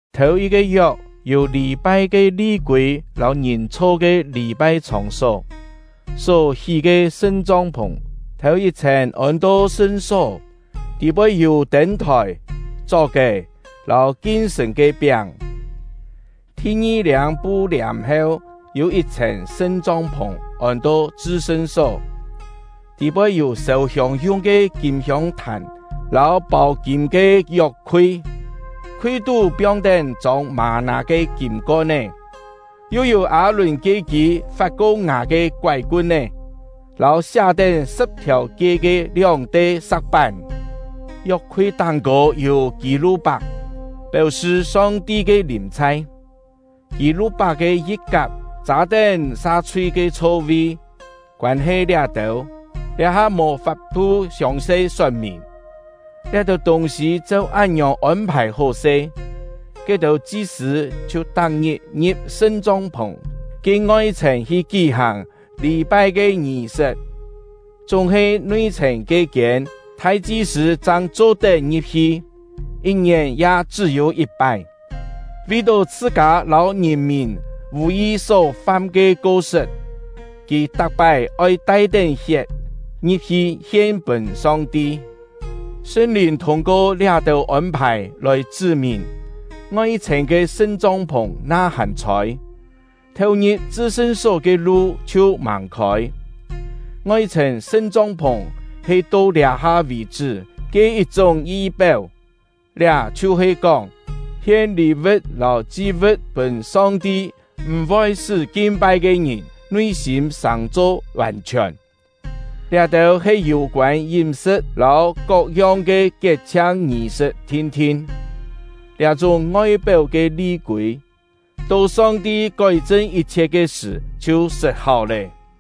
Thèu-yit-ke yok, yû lî-pai ke li-kûi lâu ngìn chho ke lî-pai chhòng-só. Só hí ke sṳn-chong-phùng, thèu-yit-chhèn ôn-to sṳn-só, tî-poi yû tên-thòi, chok-è, lâu kin-sṳ̀n ke piáng. Thi-ngi-liâng pu-liàm heu, yû yit-chhèn sṳn-chong-phùng ôn-to chṳ-sṳn-só, tî-poi yû sêu-hiông yung ke kîm hiông-thàn lâu pâu-kîm ke yok-khui, khui-tú piong-tén chông mâ-nâ ke kîm kon-é, yu yû Â-lùn ke-kî fat-ko ngà ke koái-kun-é lâu siá-tén sṳ̍p-thiàu-kie ke lióng-te sa̍k-pán. Yok-khui táng-kô yû kî-lu-pak, péu-sṳ Song-ti ke lìm-chhai; kî-lu-pak ke yi̍t-kap châ-tén sa-chhui ke chho-vi. Koân-he liá-têu, liá-ha mò fap-thu siòng-se sot-mìn. Liá-têu tûng-sî cheu án-ngiòng ôn-phài hó-se. Ke-têu chi-sṳ̂ chhiu tak-ngit ngi̍p sṳn-chong-phùng ke ngoi-chhèn hi kí-hàng lî-pai ke ngì-sṳt; chúng-he nui-chhèn ke-kiên, thai-chi-sṳ̂ chang cho-tet ngi̍p-hi, yit-ngièn ya chṳ́-yû yit-pái; vi-tó chhṳ-kâ lâu ngìn-mìn vù-yi só fam ke ko-sṳt, kì tak-pái oi tai-tén hiet ngi̍p-hi hien-pûn Song-ti. Sṳn-Lìn thûng-ko liá-têu ôn-phài lòi chṳ́-mìn, ngoi-chhèn ke sṳn-chong-phùng na hàn chhôi, theu-ngi̍p chṳ-sṳn-só ke lu chhiu màng khôi. Ngoi-chhèn sṳn-chong-phùng he to liá-ha vì-chṳ́ ke yit-chúng yi-péu. Liá chhiu-he kóng, hien lî-vu̍t lâu chi-vu̍t pûn Song-ti m̀-voi sṳ́ kin-pai ke ngìn nui-sîm sàng-cho vàn-chhiòn; liá-têu he yû-koân yím-sṳ̍t lâu kok-yong ke kiet-chhiang ngì-sṳt thin-thin. Liá-chúng ngoi-péu ke li-kûi, to Song-ti kói-chṳn yit-chhiet ke sṳ̀ chhiu sṳt-háu lé.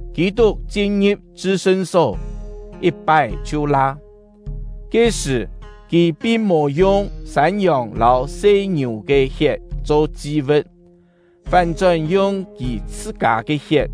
Kî-tuk chin-ngi̍p chṳ-sṳn-só, yit-pái chhiu la; ke-sṳ̀, kì pin mò yung sân-yòng lâu se-ngiù ke hiet cho chi-vu̍t, fán-chón yung kì chhṳ-kâ ke hiet,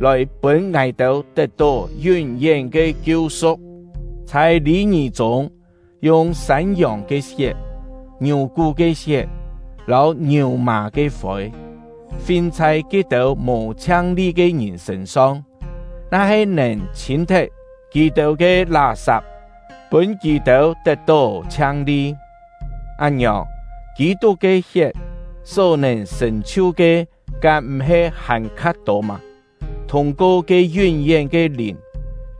lòi pûn ngài-têu tet-tó yún-yén ke kiu-su̍k. Chhai lî-ngì chûng, yung sân-yòng ke hiet, ngiù-kú ke hiet, lâu ngiù-mà ke fôi, fin chhai ke-têu mò chhiang-li ke ngìn sṳ̂n-song, na-he nèn chhîn-thet kì-têu ke lá-sap, pûn kì-têu tet-tó chhiang-li, án-ngiòng, Kî-tuk ke hiet só-nèn sṳ̀n-chhiu ke kám m̀-he hàn-kha tô mâ? Thûng-ko ke yún-yén ke Lìn,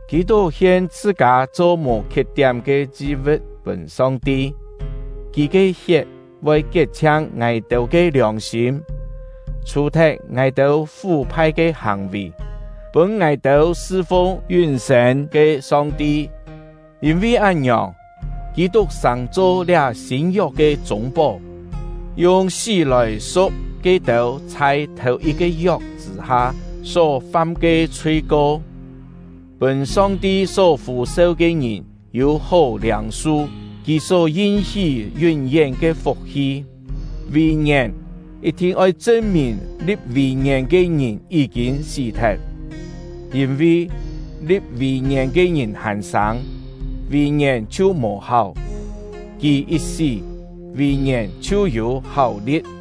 Kî-tuk hien chhṳ-kâ cho mò khiet-tiám ke chi-vu̍t pûn Song-ti. Kì ke hiet voi kiet-chhiang ngài-têu ke liòng-sîm, chhù-thet ngài-têu fú-phai ke hàng-vì, pûn ngài-têu sṳ-fung yún-sên ke Song-ti. Yîn-vi án-ngiòng, Kî-tuk sàng-cho liá sîn-yok ke chûng-pó, yung sí lòi su̍k ke-têu chhai thèu-yit-ke yok chṳ̂-ha só-fam ke chhui-ko, pûn Song-ti só fû-seu ke ngìn yû-hó liâng-su Kì só yin-hí yún-yén ke fuk-hi. Vùi-ngièn, yit-thin oi chṳn-mìn li̍p vùi-ngièn ke ngìn yí-kîn sí-thet; yîn-vi, li̍p vùi-ngièn ke ngìn hàn sâng, vùi-ngièn chhiu mò-háu, kì yit sí, vùi-ngièn chhiu yû háu-li̍t.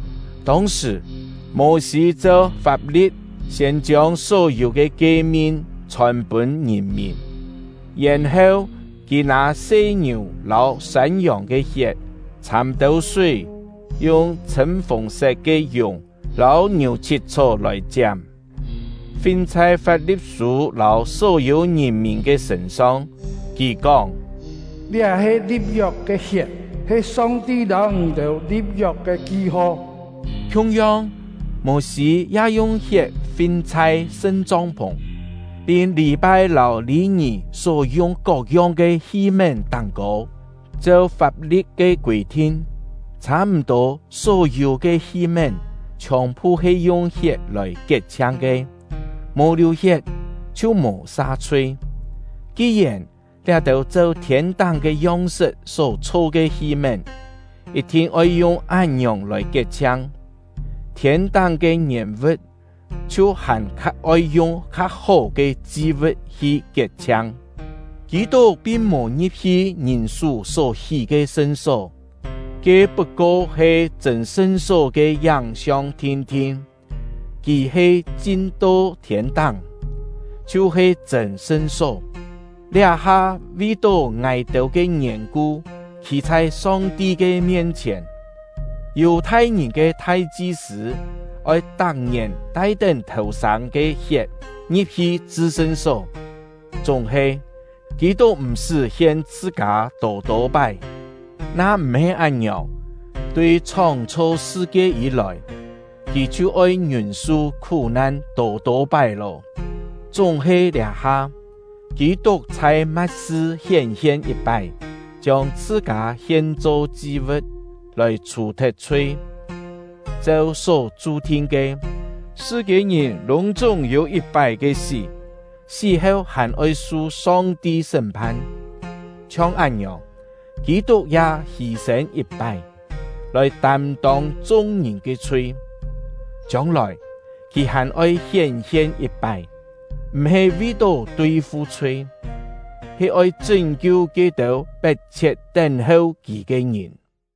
Tông-sṳ̀, Mô-sî cheu fap-li̍t siên chiông só-yû ke kie-min chhòn-pûn ngìn-mìn, yèn-heu kì nâ se-ngiù lâu sân-yòng ke hiet, chhâm têu súi, yung chhṳ̂m-fùng-set ke yùng lâu ngiù-chhit-chhó lòi chiám, fin chhai Fap-li̍t-sû lâu só-yû ngìn-mìn ke sṳ̂n-song. Kì kóng: “Liá he li̍p-yok ke hiet, he Song-ti lâu ngì-têu li̍p-yok ke ki-ho.” Khiung-yong, Mô-sî ya yung hiet fin chhai sṳn-chong-phùng, pin lî-pai lâu lî-ngì só yung kok-yong ke hi-mén táng-kô. Cheu fap-li̍t ke kûi-thin, chhâ-m̀-tô só-yû ke hi-mén chhiòn-phu he yung hiet lòi kiet-chhiang ke; mò liù-hiet, chhiu mò sa-chhui. Ki-yèn liá-têu cheu thiên-táng ke yong-sṳt só chho ke hi-mén, yit-thin oi yung án-ngiòng lòi kiet-chhiang; thiên-táng ke ngièn-vu̍t chhiu hàn-kha oi yung kien-hó ke chi-vu̍t hi kiet-chhiang. Kî-tuk pin mò ngi̍p-hi ngìn-sú só hí ke sṳn-só; ke put-ko he chṳ̂n sṳn-só ke yáng-siong thin-thin. Kì he chin-to thiên-táng, chhiu-he chṳ̂n sṳn-só, liá-ha vi-tó ngài-têu ke yèn-ku khî chhai Song-ti ke mien-chhièn. Yù-thai-ngìn ke thai-chi-sṳ̂ oi tak-ngièn tai-tén thèu-sâng ke hiet ngi̍p-hi chṳ-sṳn-só; chúng-he, Kî-tuk m̀-sṳ́ hien chhṳ-kâ tô-tô pái. Na m̀-he án-ngiòng, tui chhóng-chho sṳ-kie yî-lòi, kì chhiu oi ngiûn-su khú-nan tô-tô pái lô. Chúng-he liá-ha, Kî-tuk chhai ma̍t-sṳ hién-hien yit-pái, chiông chhṳ-kâ hien-cho chi-vu̍t, lòi chhù-thet chhui. Cheu só chu-thin ke, sṳ-kiên-ngìn lûng-chúng yû yit-pái ke sí, sí-heu hàn-oi su Song-ti sṳ́m-phan. Chhiong án-ngiòng, Kî-tuk ya hî-sên yit-pái, lòi tâm-tông chung-ngìn ke chhui. Chiông-lòi, kì hàn-oi hién-hien yit-pái, m̀-he vi-tó tui-fu chhui, he oi chṳ́n-kiu ke-têu pet-chhiet tén-heu kì ke ngìn.